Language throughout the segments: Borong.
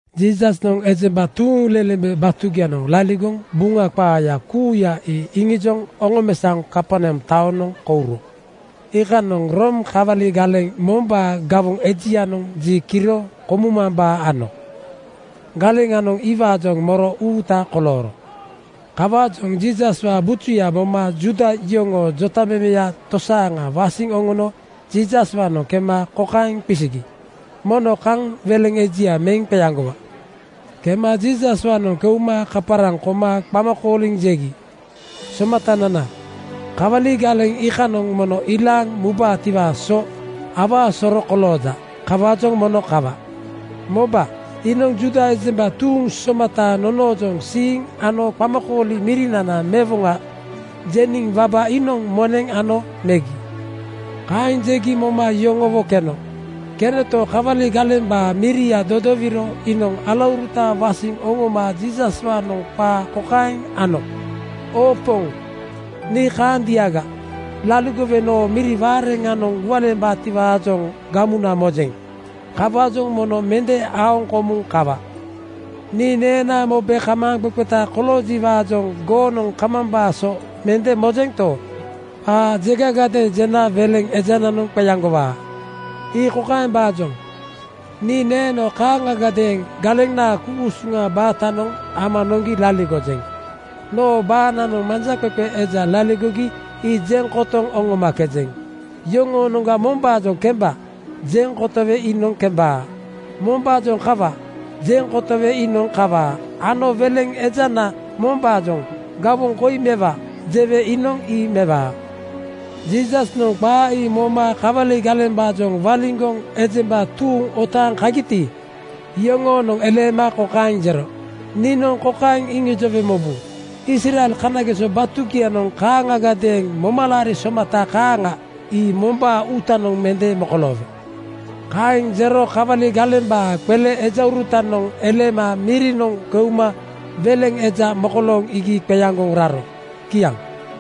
Jiisasnoŋ ejemba tuuŋlelembe batugianoŋ laligoŋ Buŋa qaaya kuuya ii iŋijoŋ oŋomesaoŋ Kaperneam taonoŋ kouro. Iikanoŋ Room kawali galeŋ mombaa gawoŋ ejianoŋ ji kiro komumambaa ano. Galeŋanoŋ iwaajoŋ moro uuta kolooro. Kawaajoŋ Jiisaswaa bujuya moma Juuda yoŋoo jotamemeya tosaaŋa wasiŋ oŋono Jiisaswaanoŋ kema kokaeŋ qisigi, “Mono kaŋ weleŋ ejia meŋ qeaŋgowa.” Kema Jiisaswaanoŋ keuma kaparaŋ koma qama kooliŋ jegi, “Somatanana, kawali galeŋ iikanoŋ mono ilaaŋ mubaatiwaa so awaa soro kolooja. Kawaajoŋ mono kawa.” Moba, iinoŋ Juuda ejemba tuuŋ somata nonoojoŋ siiŋ ano ‘Qamakooli mirinana mewoŋa,’ jeniŋ waba iinoŋ moneŋ ano megi.” Kaeŋ jegi moma yoŋowo keno. Kenoto, kawali galembaa miria dodowiro iinoŋ alauruta wasiŋ oŋoma Jiisaswaajoŋ qaa kokaeŋ ano, “Oo Poŋ, nii kaandiaga laligowe noo miri waareŋanoŋ gualeembaatiwaajoŋ gamuna mojeŋ. Kawaajoŋ mono mende aoŋ komuŋ kawa. Nii neenaa mobe kamaaŋqeqeta koloojiwaajoŋ goonoŋ kamambaa so mende mojento, qaa jegagadeeŋ jena weleŋ ejananoŋ qeaŋgowaa. Ii kokaembaajoŋ: Nii neeno kaaŋagadeeŋ galenaa ku-usuŋ baatanoŋ ama noŋgi laligojeŋ. Noo baananoŋ manjaqeqe eja laligogi ii jeŋ kotoŋ oŋomakejeŋ. Yoŋoonoŋga mombaajoŋ ‘Kemba!’ jeŋ kotowe iinoŋ kembaa. Mombaajoŋ ‘Kawa!’ jeŋ kotowe iinoŋ kawaa ano weleŋ ejana mombaajoŋ ‘Gawoŋ koi mewa!’ jewe iinoŋ ii mewaa.” Jiisasnoŋ qaa ii moma kawali galembaajoŋ waliŋgoŋ ejemba tuuŋ otaaŋ kagiti, iyoŋoonoŋ eleema kokaeŋ jero, “Niinoŋ kokaeŋ iŋijowe mobu: Israel kanageso batugianoŋ kaaŋagadeeŋ momalaari somata kaaŋa ii mombaa uutanoŋ mende mokoloowe.” Kaeŋ jero kawali galembaa qele ejaurutanoŋ eleema mirinoŋ keuma weleŋ eja mokolooŋ iigi qeaŋgoŋ raro. Kiaŋ.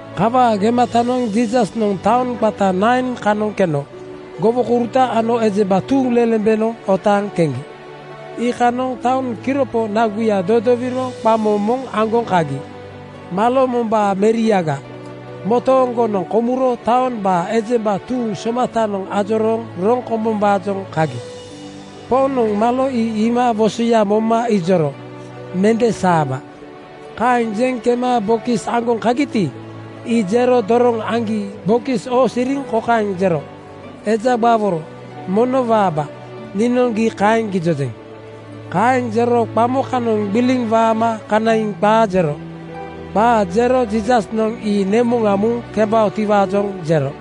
Kawaa gematanoŋ Jiisasnoŋ taoŋ qata Nain kanoŋ keno gowokouruta ano ejemba tuuŋlelembenoŋ otaaŋ keŋgi. Iikanoŋ taoŋ kiropo naguya dodowiro qamo moŋ aŋgoŋ kagi. Malo mombaa meriaga motooŋgonoŋ komuro taombaa ejemba tuuŋ somatanoŋ ajorooŋ roŋ kombombaajoŋ kagi. Poŋnoŋ malo ii iima wosoya moma ijoro, “Mende saaba.” Kaeŋ jeŋ kema bokis aŋgoŋ kagiti, ii jero doroŋ aŋgi bokis oosiriŋ kokaeŋ jero, “Eja gbaworo, mono waaba. Niinoŋ gii kaeŋ gijojeŋ.” Kaeŋ jero qamo kanoŋ gbiliŋ waama kanaiŋ qaa jero. Qaa jero Jiisasnoŋ ii nemuŋa muŋ kembaotiwaajoŋ jero.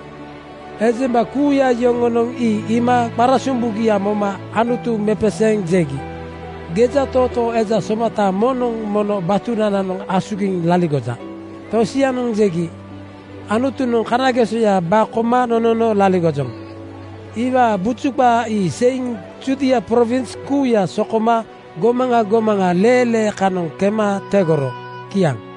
Ejemba kuuya yoŋonoŋ ii iima qarasombugia moma Anutu mepeseeŋ jegi, “Gejatootoo eja somata moŋnoŋ mono batunananoŋ asugiŋ laligoja.” Tosianoŋ jegi, “Anutunoŋ kanagesoya ba koma nonono laligojoŋ.” Iwaa buju qaa ii seiŋ Judia prowins kuuya so koma gomaŋa gomaŋa leelee kanoŋ kema tegoro. Kiaŋ.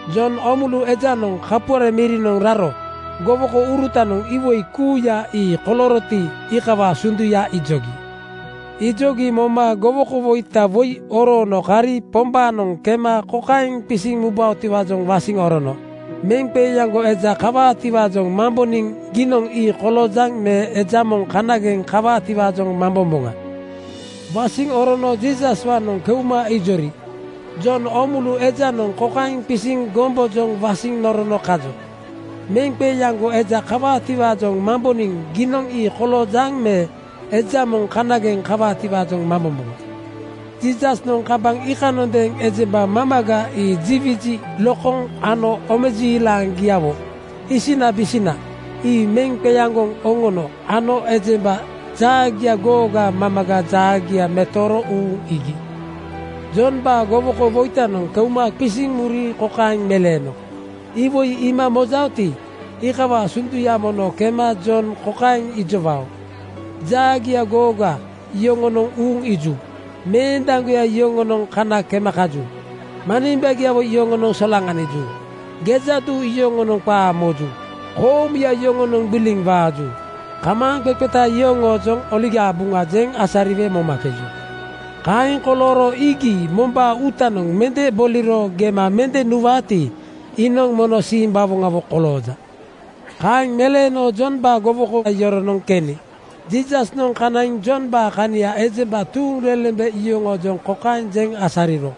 Jon Oomulu ejanoŋ kapuare mirinoŋ raro gowokourutanoŋ iwoi kuuya ii kolooroti, iikawaa sunduya ijogi. Ijogi moma gowokowoita woi oroono kari Pombaanoŋ kema kokaeŋ qisiŋ mubaotiwaajoŋ wasiŋ orono, “Meŋqeeaŋgo eja kawaatiwaajoŋ mamboniŋ giinoŋ ii koloojaŋ me eja moŋ kanageŋ kawaatiwaajoŋ mambomboŋa.” Wasiŋ orono Jiisaswaanoŋ keuma ijori, “Jon Oomulu ejanoŋ kokaeŋ qisiŋ gombojoŋ wasiŋ norono kajo, ‘Meŋqeeaŋgo eja kawaatiwaajoŋ mamboniŋ giinoŋ ii koloojaŋ me eja moŋ kanageŋ kawaatiwaajoŋ mambomboŋa.’” Jiisasnoŋ kambaŋ iikanondeeŋ ejemba mamaga ji wiji lokoŋ ano omejiilaŋgiawo (isinabisina) ii meŋ qeaŋgoŋ oŋono ano ejemba jaagia googa mamaga jaagia metooro uuŋ iigi. Jombaa gowokowoitanoŋ keuma qisiŋ muri kokaeŋ meleeno, “Iwoi iima mojaoti, iikawaa sunduya mono kema Jon kokaeŋ ijowao: Jaagia googa yoŋonoŋ uuŋ iiju. Meendaŋgoya yoŋonoŋ kana kema kaju. Manimbagiawo yoŋonoŋ solaŋaniju. Gejaduu yoŋonoŋ qaa moju. Koomuya yoŋonoŋ gbiliŋ waaju. Kamaaŋqeqeta yoŋoojoŋ Oligaa Buŋa jeŋ asariwe momakeju. Kaeŋ kolooro iigi mombaa uutanoŋ mende boliro gema mende nuwaati, iinoŋ mono simbawoŋawo kolooja.” Kaeŋ meleeno Jombaa gowoko yoronoŋ keni Jiisasnoŋ kanaiŋ Jombaa kania ejemba tuuŋlelembe yoŋoojoŋ kokaeŋ jeŋ asariro,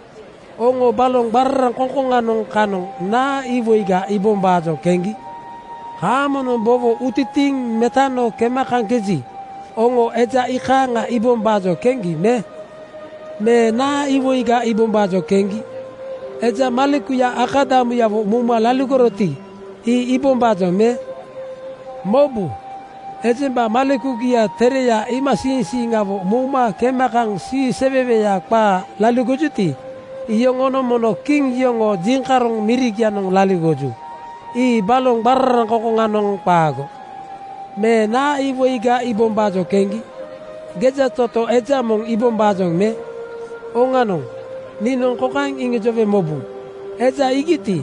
“Oŋo baloŋ qararaŋkoŋkoŋanoŋ kanoŋ naa iwoiga iibombaajoŋ keŋgi? Haamonoŋ bowo utitiiŋ metano kema kaŋkeji, oŋo eja iikaaŋa iibombaajoŋ keŋgi me? “Me naa iwoiga iibombaajoŋ keŋgi? Eja malekuya akadamuyawo mouma laligoroti, ii iibombaajoŋ me? Mobu, ejemba malekugia tereya iimasiiŋsiiŋawo mouma kema kaŋ siiseweweya qaa laligojuti, iyoŋonoŋ mono kiŋ yoŋoo jiŋkaroŋ mirigianoŋ laligoju. Ii baloŋ qararaŋkoŋkoŋanoŋ qaago. “Me naa iwoiga iibombaajoŋ keŋgi? Gejatootoo eja moŋ iibombaajoŋ me? Oŋanoŋ, niinoŋ kokaeŋ iŋijowe mobu: Eja iigiti,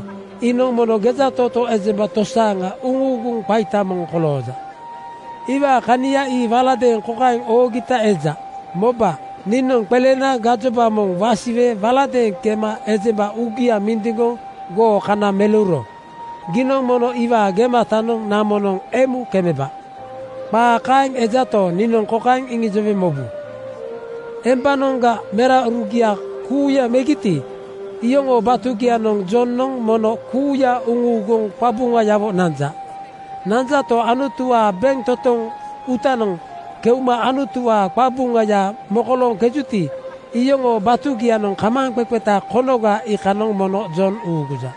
iinoŋ mono gejatootoo ejemba tosaaŋa uŋuuguŋ qaita moŋ kolooja. Iwaa kania ii waladeeŋ kokaeŋ oogita eja, ‘Moba, niinoŋ qelena gajoba moŋ wasiwe waladeeŋ kema ejemba uugia mindiŋgoŋ goo kana meleuro giinoŋ mono iwaa gematanoŋ namonoŋ emu kemeba.’ Qaa kaeŋ ejato, niinoŋ kokaeŋ iŋijowe mobu: Embanoŋga meraurugia kuuya megiti, iyoŋoo batugianoŋ Jonoŋ mono kuuya uŋuuguŋ qabuŋayawo nanja. Nanjato, Anutuwaa bentotoŋ uutanoŋ keuma Anutuwaa qabuŋaya mokolooŋkejuti, iyoŋoo batugianoŋ kamaaŋqeqeta konoga iinoŋ mono Jon uuguja.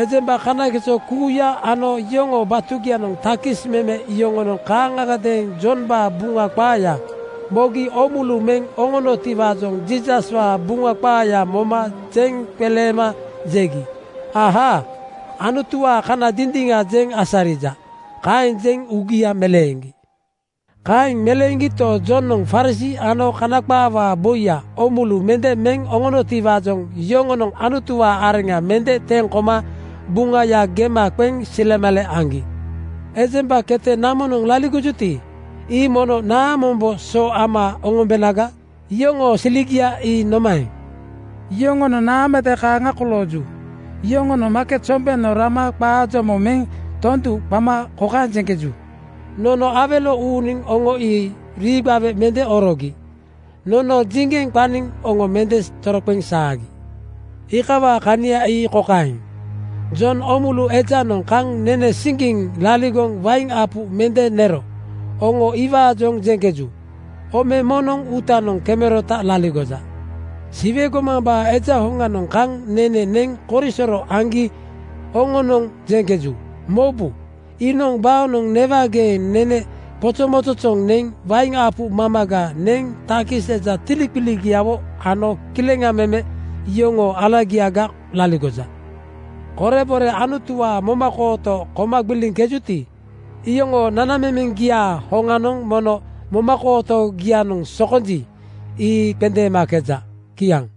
“Ejemba kanageso kuuya ano yoŋoo batugianoŋ takis meme yoŋonoŋ kaaŋgadeeŋ Jombaa Buŋa qaaya mogi oomulu meŋ oŋonotiwaajoŋ Jiisaswaa Buŋa qaaya moma jeŋ qeleema jegi, “Ahaa! Anutuwaa kana dindiŋa jeŋ asarija.” Kaeŋ jeŋ uugia meleeŋgi. Kaeŋ meleeŋgito, Jonoŋ Farisii ano Kana qaawaa boi oomulu mende meŋ oŋonotiwaajoŋ yoŋonoŋ Anutuwaa areŋa mende teŋ koma Buŋaya gema qeŋ silemale aŋgi. “Ejemba kete namonoŋ laligojuti, ii mono naamombo so ama oŋombenaga? Yoŋoo siligia ii nomaeŋ? Yoŋonoŋ naamade kaaŋa kolooju. Yoŋonoŋ maaket sombenoŋ rama qaa jomo meŋ tondu qama kokaeŋ jeŋkeju, ‘Nono awelo uuniŋ oŋo rii gbawe mende orogi. Nono jiŋgeŋ qaniŋ oŋo mende toroqeŋ saagi.’ Iikawaa kania ii kokaeŋ: Jon Oomulu ejanoŋ kaŋ nene siŋgiŋ laligoŋ wain apu mende nero oŋo iwaajoŋ jeŋkeju, ‘Ome moŋnoŋ uutanoŋ kemerota laligoja.’ “Siwe gomambaa Eja hoŋanoŋ kaŋ nene neŋ korisoro aŋgi oŋonoŋ jeŋkeju, ‘Mobu, iinoŋ baonoŋ newageeŋ nene qozozoŋgoŋ neŋ wain apu mamaga neŋ takis eja tiliqiligiawo ano kileŋa meme yoŋoo alagiaga laligoja.’ Korebore Anutuwaa momakooto koma gbiliŋkejuti, iyoŋoo nanamemeŋgiaa hoŋanoŋ mono momakooto-gianoŋ sokonji, ii qendeemakeja.” Kiaŋ.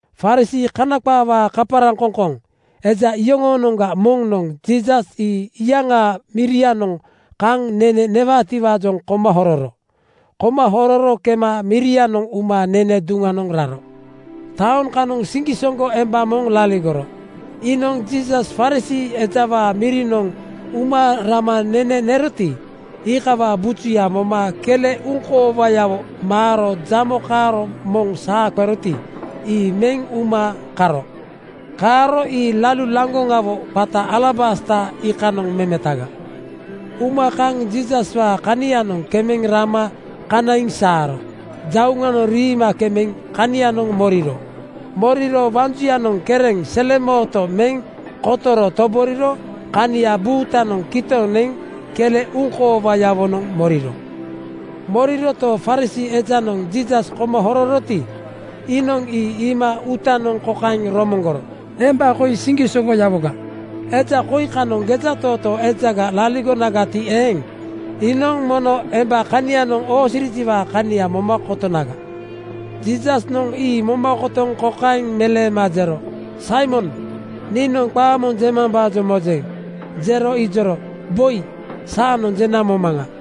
Farisii (Kana qaawaa kaparaŋkoŋkoŋ) eja yoŋoonoŋga moŋnoŋ Jiisas ii iyaŋaa mirianoŋ kaŋ nene newaatiwaa koma hororo. Koma hororo kema mirianoŋ uma nene duŋnoŋ raro. Taoŋ kanoŋ siŋgisoŋgo emba moŋ laligoro. Iinoŋ Jiisas Farisii ejawaa mirinoŋ uma rama nene neroti, iikawaa bujuya moma kele uŋkoowayawo maaro jamo kaaro moŋ saa qeroti, ii meŋ uma karo. Kaaro ii lalu laŋgoŋawo qata alabasta iikanoŋ memetaga. Uma kaŋ Jiisaswaa kanianoŋ kemeŋ rama kanaiŋ saaro jauŋanoŋ riima kemeŋ kanianoŋ moriro. Moriro waŋ juyanoŋ kereŋ, selemooto meŋ kotoro toboriro kania buutanoŋ kitoŋ neŋ kele uŋkoowayawonoŋ moriro. Moriroto, Farisii ejanoŋ Jiisas koma hororoti, iinoŋ ii iima uutanoŋ kokaeŋ romoŋgoro, “Emba koi siŋgisoŋgoyawoga. Eja koi kanoŋ gejatootoo ejaga laligonagati eeŋ, iinoŋ mono emba kanianoŋ oosirijiwaa kania moma kotonaga.” Jiisasnoŋ ii moma kotoŋ kokaeŋ meleema jero, “Saimon, niinoŋ qaa moŋ jemambaajoŋ mojeŋ.” Jero ijoro, “Boi, saanoŋ jena momaŋa.”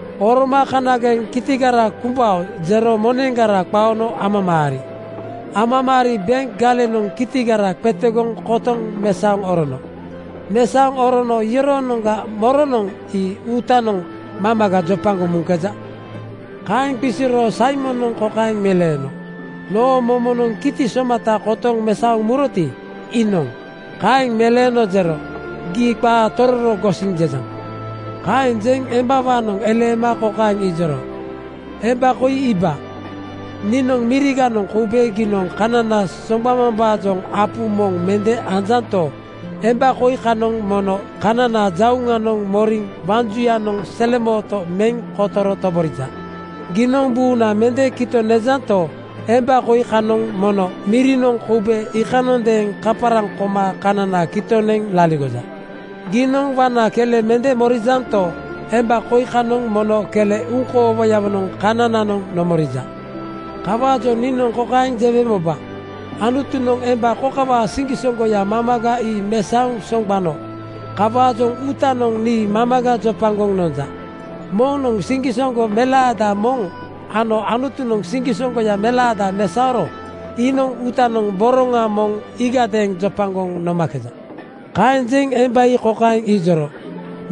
Oroma kanageŋ kitigara kumbao jero moneŋgara qaono amamaari. Amamaari benk galeŋanoŋ kitigara qetegoŋ kotoŋ mesaoŋ orono. Mesaoŋ orono iyoroonoŋga moronoŋ ii uutanoŋ mamaga jopagoŋ muŋkeja?” Kaeŋ qisiro Saimonoŋ kokaeŋ meleeno, “Noo momonoŋ kiti somata kotoŋ mesaoŋ muroti, iinoŋ.” Kaeŋ meleeno jero, “Gii qaa tororo gosiŋ jejaŋ.” Kaeŋ jeŋ embawaanoŋ eleema kokaeŋ ijoro, “Emba koi iiba. Niinoŋ miriganoŋ koube giinoŋ kanana soŋgbamambaajoŋ apu moŋ mende nonjanto, emba koi kanoŋ mono kanana jauŋanoŋ moriŋ waŋ juyanoŋ selemooto meŋ kotoro toborija. Giinoŋ buuna mende kitoŋ nejanto, emba koi kanoŋ mono mirinoŋ koube iikanondeeŋ kaparaŋ koma kanana kitoŋ neŋ laligoja. Giinoŋ waŋna kele mende morijanto, emba koi kanoŋ mono kele uŋkoowayawonoŋ kanananoŋ nomorija. Kawaajoŋ niinoŋ kokaeŋ jewe moba: Anutunoŋ emba kokawaa siŋgisoŋgoya mamaga ii mesaoŋ soŋgbano kawaajoŋ uutanoŋ nii mamaga jopagoŋ nonja. Moŋnoŋ siŋgisoŋgo melaada moŋ ano Anutunoŋ siŋgisoŋgoya melaada mesaoro iinoŋ uutanoŋ boroŋa moŋ iigadeeŋ jopagoŋ nomakeja.” Kaeŋ jeŋ emba ii kokaeŋ ijoro,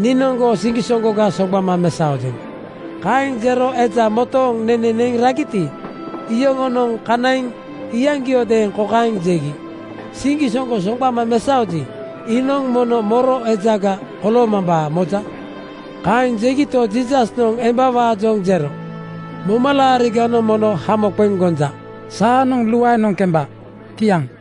“Niinoŋ goo siŋgisoŋgoga soŋgbama mesaojeŋ.” Kaeŋ jero eja motooŋ nene neŋ ragiti, iyoŋonoŋ kanaiŋ iyaŋgiodeeŋ kokaeŋ jegi, “Siŋgisoŋgo soŋgbama mesaoji, iinoŋ mono moro ejaga koloomambaa moja?” Kaeŋ jegito, Jiisasnoŋ embawaajoŋ jero, “Momalaariganoŋ mono hamo qeŋ gonja. Saanoŋ luaenoŋ kemba.” Kiaŋ.